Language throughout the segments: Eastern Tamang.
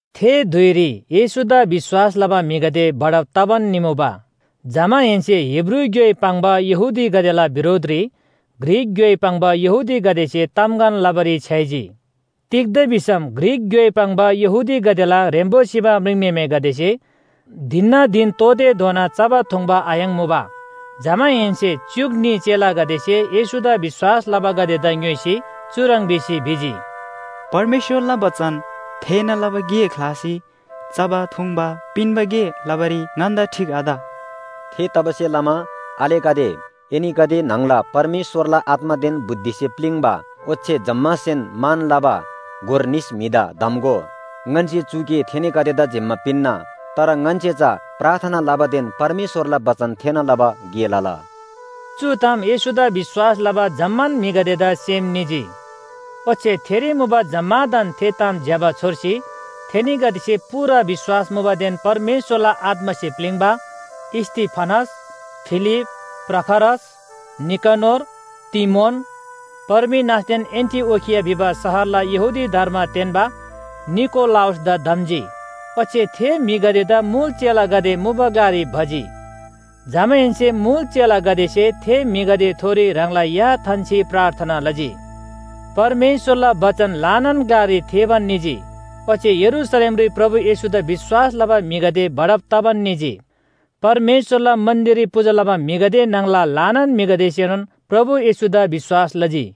थे धुइरी येशूदा विश्‍वास लबा म्‍हिगदे बढब तबान निमुबा। जमाहेन्‍से हिब्रू ग्‍योइ पाङ्बा यहूदीगदेला बिरोधरी ग्रीक ग्‍योइ पाङ्बा यहूदीगदेसे तामगन लबारी छ्‌याइजी। तिग्‍दा भिसम ग्रीक ग्‍योइ पाङ्बा यहूदीगदेला ह्रेम्‍बो सिबा म्रिङम्‍हेमेगदेसे धिनना धिन तोःतेधोना चबा थुङ्बा आयाङ्‌मुबा। जमाहेन्‍से च्‍युक न्‍ही चेलागदेसे येशूदा विश्‍वास लबागदेदा ङ्‌योइसी चुह्रङ् भिसी भिजी, “परमेश्‍वरला बचन थेःना लबा गे ख्‍लासी चबा थुङ्बा पिन्‍बा गे लबारी ङन्‍दा ठीक आत। थेतबासेलमा आलेगदे, एनीगदे न्‍हङला परमेश्‍वरला आत्‍मादेन बुद्धिसे प्‍लिङ्बा, ओच्‍छे जम्‍मासेन मान लबा गोर निस म्‍हिदा धम्‍गो, ङन्‍से चु गे थेनीगदेदा जिम्‍मा पिन्‍ना। तर ङन्‍से चा प्रार्थना लबादेन परमेश्‍वरला बचन थेःना लबा गे लला।” चु ताम येशूदा विश्‍वास लबा जम्‍मान म्‍हिगदेदा सेम निजी। ओच्‍छे थेरी मुबा जम्‍मादान थे ताम ज्‍यबा छोर्सी थेनीगदेसे पूरा विश्‍वास मुबादेन परमेश्‍वरला आत्‍मासे प्‍लिङ्बा स्‍तिफनस, फिलिप, प्रखरस, निकनोर, तीमोन, पर्मिनासदेन एन्‍टिओखिया भिबा शहरला यहूदी धर्म तेन्‍बा निकोलाउसदा धम्‍जी। ओच्‍छे थे म्‍हिगदेदा मुल चेलागदे मुबा ग्‍लारी भजी। जमाहेन्‍से मुल चेलागदेसे थे म्‍हिगदेथोरी ह्राङला या थान्‍सी प्रार्थना लजी। परमेश्‍वरला बचन ल्‍हानान ग्‍लारी थेःबान निजी, ओच्‍छे यरूशलेमरी प्रभु येशूदा विश्‍वास लबा म्‍हिगदे बढब तबान निजी। परमेश्‍वरला मन्‍दिररी पूजा लबा म्‍हिगदे न्‍हङला ल्‍हानान म्‍हिगदेसेनोन प्रभु येशूदा विश्‍वास लजी।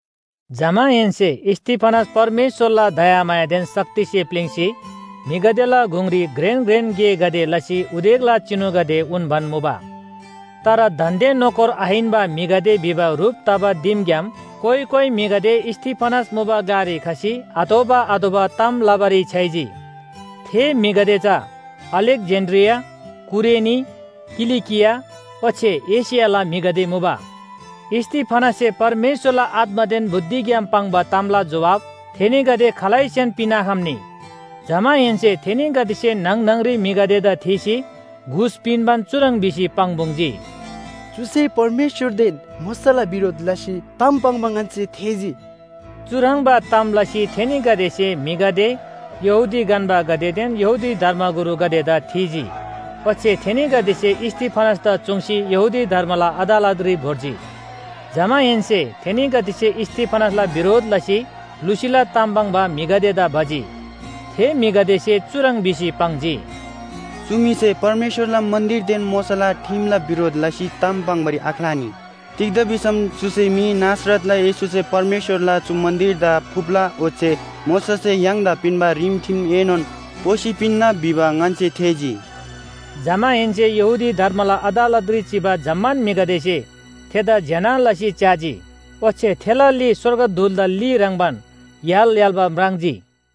जमाहेन्‍से स्‍तिफनस परमेश्‍वरला दयामायादेन शक्तिसे प्‍लिङ्‌सी म्‍हिगदेला गुङरी घ्रेन घ्रेन गेगदे लसी उदेकला चिनुगदे उन्‍बान मुबा। तर दान्‍दे नोकर आहिन्‍बा म्‍हिगदे भिबा ह्रुप तबा दिमग्‍याम कोइ कोइ म्‍हिगदे स्‍तिफनस मुबा ग्‍लारी खसी आतोःबा आतोःबा ताम लबारी छ्‌याइजी। थे म्‍हिगदे चा अलेक्‍जेन्‍ड्रिया, कुरेनी, किलिकिया ओच्‍छे एशियाला म्‍हिगदे मुबा। स्‍तिफनससे परमेश्‍वरला आत्‍मादेन बुद्धिग्‍याम पाङ्बा तामला जोहाब थेनीगदे खालैसेन पिन्‍आखम्‍नी। जमाहेन्‍से थेनीगदेसे न्‍हङ न्‍हङरी म्‍हिगदेदा थीसी घुस पिन्‍बान चुह्रङ् भिसी पाङ्‌पुङ्‌जी, “चुसे परमेश्‍वरदेन मोशाला बिरोध लसी ताम पाङ्बा ङन्‍से थेःजी।” चुह्रङ्बा ताम लसी थेनीगदेसे म्‍हिगदे, यहूदी गन्‍बागदेदेन यहूदी धर्मगुरुगदेदा थीजी। ओच्‍छे थेनीगदेसे स्‍तिफनसदा चुङ्सी यहूदी धर्मला अदालतरी भोर्जी। जमाहेन्‍से थेनीगदेसे स्‍तिफनसला बिरोध लसी लुसीला ताम पाङ्बा म्‍हिगदेदा भजी। थे म्‍हिगदेसे चुह्रङ् भिसी पाङ्जी, “चु म्‍हिसे परमेश्‍वरला मन्‍दिरदेन मोशाला ठिमला बिरोध लसी ताम पाङ्‌बारी आख्‍लानी। तिग्‍दा भिसम चुसे मी ‘नासरतला येशूसे परमेश्‍वरला चु मन्‍दिरदा फुप्‍ला ओच्‍छे मोशासे य्‍हाङदा पिन्‍बा रिमठिमएनोन पोसी पिन्‍ना’ भिबा ङन्‍से थेःजी।” जमाहेन्‍से यहूदी धर्मला अदालतरी चिबा जम्‍मान म्‍हिगदेसे थेदा ज्‍यना लसी च्‍याजी। ओच्‍छे थेला ली स्‍वर्गदूतला ली ह्रङ्‌बान य्‍हाल य्‍हाल्‍बा म्राङ्जी।